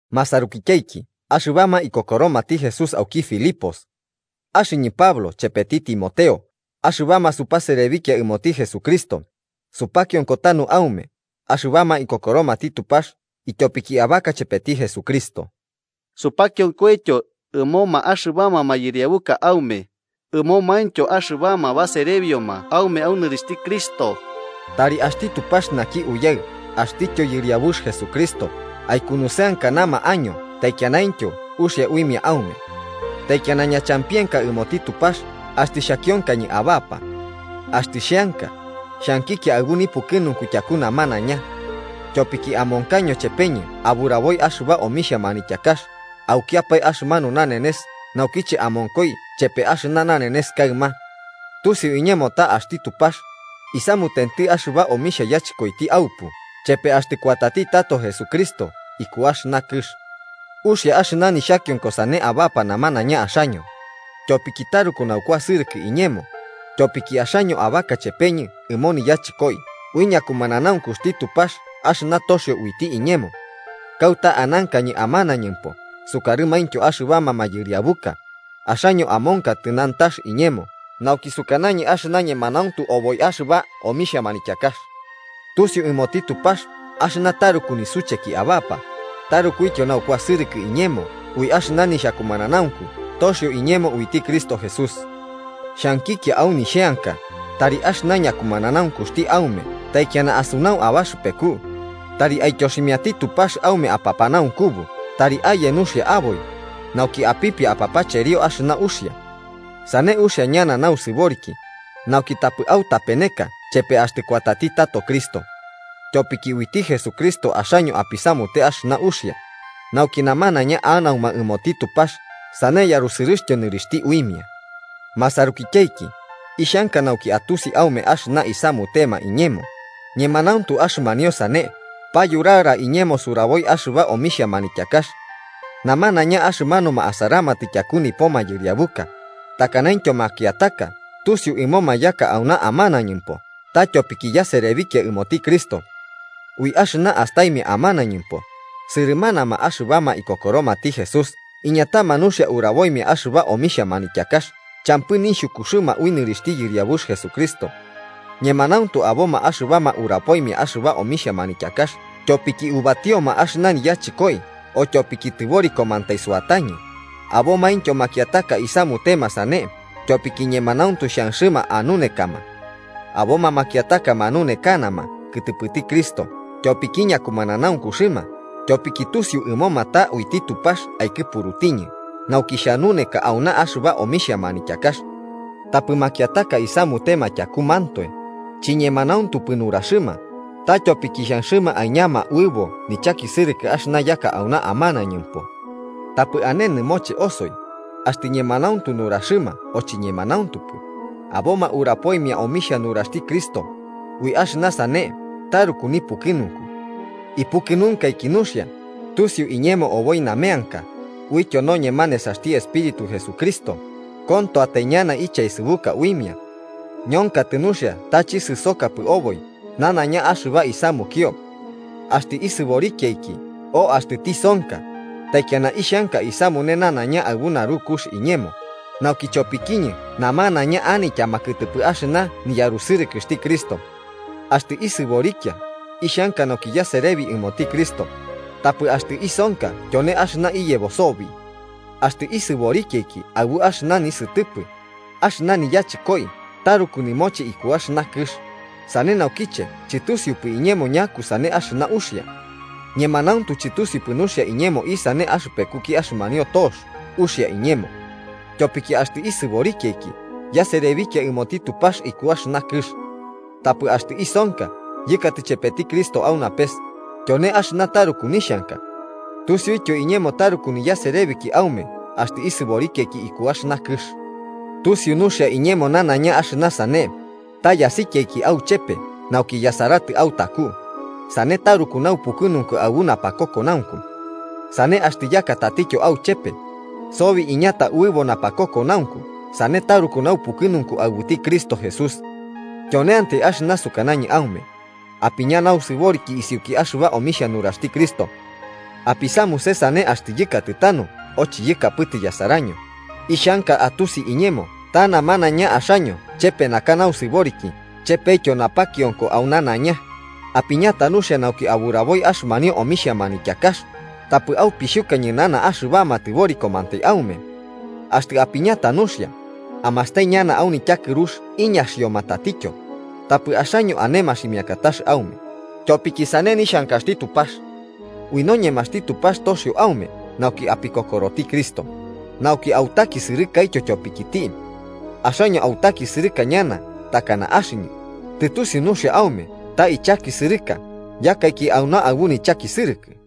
Masarukityaiki axɨbama ikokoromati Jesús auki Filipos: Axɨñɨ, Pablo chepeti Timoteo, axɨbama supaserebikia ɨmoti Jesucristo, supakionko tanu aume, axɨbama ikokoromati Tupax tyopiki abaka chepeti Jesucristo. Supakionkoityo ɨmoma axɨbama mayɨriabuka aume, ɨmomaintyo axɨbama baserebioma aume au nɨrixhti Cristo. Tari axti Tupax naki Uyaɨ axtityo Yɨriabux Jesucristo aikunusɨankanama año taikianaintyo uxia uimia aume. Taikiana ñachampienka ɨmoti Tupax axtɨ xhakionkañɨ abapa. Axtɨ xheanka, xhankikia aɨbu nipukɨnunku tyaku namanaiña. Tyopiki amonkaño chepeñɨ aburaboi axɨba omixhia manityakax aukiapae axɨmanu nanenes naukiche amonkoi chepe axɨna nanenes kaɨma. Tusiu iñemo ta axti Tupax, isamutenti axɨba omixhia yachɨkoiti aupu chepe axtɨ kuatati tato Jesucristo iku axɨna kɨx. Uxia axɨna nixhakionko sane abapa namanaiña axaño, tyopiki taruku naukuasɨrɨkɨ iñemo, tyopiki axaño abaka chepeñɨ ɨmo niyachɨkoi ui ñakumananaunkuxti Tupax axɨna toxio uiti iñemo. Kauta anankañɨ amanañɨmpo sukarɨmaintyo axɨbama mayɨriabuka, axaño amonkatɨ nantax iñemo nauki sukanañɨ axɨna ñemanauntu oboi axɨba omixhia manityakax. Tusiu ɨmoti Tupax axɨna taruku nisucheki abapa, tarukuityo naukuasɨrɨkɨ iñemo ui axɨna nixhakumananaunku toxio iñemo uiti Cristo Jesús. Xhankikia au nixheanka tari axɨna ñakumananaunkuxti aume taikiana asunau abaxɨpeku, tari aityoximiati Tupax aume apapanaunkubu tari aye nuxia aboi, nauki apipia apapacherio axɨna uxia. Sane uxia ñana nausɨboriki, nauki tapɨ autapeneka chepe axtɨ kuati tato Cristo. Tyopiki uiti Jesucristo axaño apisamute axɨna uxia, nauki namanaiña anauma ɨmoti Tupax sane yarusɨrɨxtyo nɨrixhti uimia. Masarukityaiki, ixhanka nauki atusi aume axɨna isamutema iñemo, ñemanauntu axɨmanio sane payurara iñemo suraboi axɨba omixhia manityakax. Namanaiña axɨmanuma asaramatɨ tyaku nipo mayɨriabuka, takanaintyo makiataka tusiu ɨmoma yaka auna amanañɨmpo ta tyopiki yaserebikia ɨmoti Cristo. Ui axɨna astaimia amanañɨmpo, sɨrɨmanama axɨbama ikokoromati Jesús iñatama nuxia uraboimia axɨba omixhia manityakax, champɨ nixhukuxɨma au nɨrixhti Yɨriabux Jesucristo. Ñemanauntu aboma axɨbama urapoimia axɨba omixhia manityakax tyopiki ubatioma axɨna niyachɨkoi o tyopiki tɨborikomantai suatañɨ, abomaintyo makiataka isamutema sane tyopiki ñemanauntu xhanxɨma anunekama. Aboma makiataka manunekanama kɨtɨpɨti Cristo tyopiki ñakumananaunkuxɨma tyopiki tusiu ɨmoma ta uiti Tupax aikɨpurutiñi nauki xhanuneka auna axɨba omixha manityakax. Tapɨ makiataka isamutema tyakumantoe, chiñemanauntupɨ nuraxɨma, ta tyopiki xhanxɨma aiñama uɨbo nichakisɨrɨkɨ axɨna yaka auna amanañɨmpo. Tapɨ ane nɨmoche osoi, axtɨ ñemanauntu nuraxɨma o chiñemanauntupɨ, aboma urapoimia omixhia nuraxti Cristo, ui axɨna sane taruku nipukɨnunku. Ipukɨnunkaiki nuxia, tusiu iñemo oboi nameanka, uityo noñema nesaxti Espíritu Jesucristo, kontoatai ñana ichaesɨbuka uimia. Ñonkatɨ nuxia ta chisɨsokapɨ oboi nanaiña axɨba isamukio. Axtɨ isɨborikiaiki o axtɨ tisonka, taikiana ixhanka isamune nanaiña aɨbu narukux iñemo, nauki chopikiñɨ namanaiña anityama kɨtɨpɨ axɨna niyarusɨrɨkɨxti Cristo. Axtɨ isɨborikia, ixhanka nauki yaserebi ɨmoti Cristo, tapɨ axtɨ isonka tyone axɨna iyebo sobi. Axtɨ isɨborikiaiki aɨbu axɨna nisɨtɨpɨ, axɨna niyachɨkoi taruku nɨmoche iku axɨna kɨx, sane naukiche chɨtusiupɨ iñemo ñakusane axɨna uxia. Ñemanauntu chɨtusiupɨ nuxia iñemo isane axɨpekuki axɨmanio tox uxia iñemo: tyopiki axtɨ isɨborikiaiki, yaserebikia ɨmoti Tupax iku axɨna kɨx. Tapɨ axtɨ isonka yɨkatɨ chepeti Cristo au napes, tyone axɨna taruku nixhanka. Tusiuityo iñemo taruku niyaserebiki aume axtɨ isɨborikiaiki iku axɨna kɨx. Tusiu nuxia iñemo nanaiña axɨna sane, ta yasikiaiki auchepe nauki yasaratɨ autaku, sane taruku naupɨkɨnunku aɨbu napakokonaunku. Sane axtɨ yaka tatityo auchepe, sobi iñata uɨbo napakokonaunku sane taruku naupukɨnunku aɨbuti Cristo Jesús. Tyoneantai axɨna sukanañɨ aume: apiña nausɨboriki isiuki axɨba omixhia nuraxti Cristo. Apisamuse sane axtɨ yɨkatɨ tanu o chiyɨkapɨtɨ yasaraño, ixhanka atusi iñemo ta namanaiña axaño chepe naka nausɨboriki chepetyo napakionko au nanaiña, apiñata nuxia nauki aburaboi axɨmanio omixhia manityakax, tapɨ aupixhuka ñɨnana axɨbama tɨborikomantai aume. Axtɨ apiñata nuxia, amastai ñana au nityakɨrux iñaxioma tatityo, tapɨ axaño ane maximiakatax aume, tyopiki sane nixhankaxti Tupax. Ui noñemaxti Tupax toxio aume nauki apikokoroti Cristo, nauki autakisɨrɨkaityo tyopikiti. Axaño autakisɨrɨka ñana takana axɨñɨ, tɨtusiu nuxia aume ta ichakisɨrɨka yakaiki auna aɨbu nichakisɨrɨkɨ.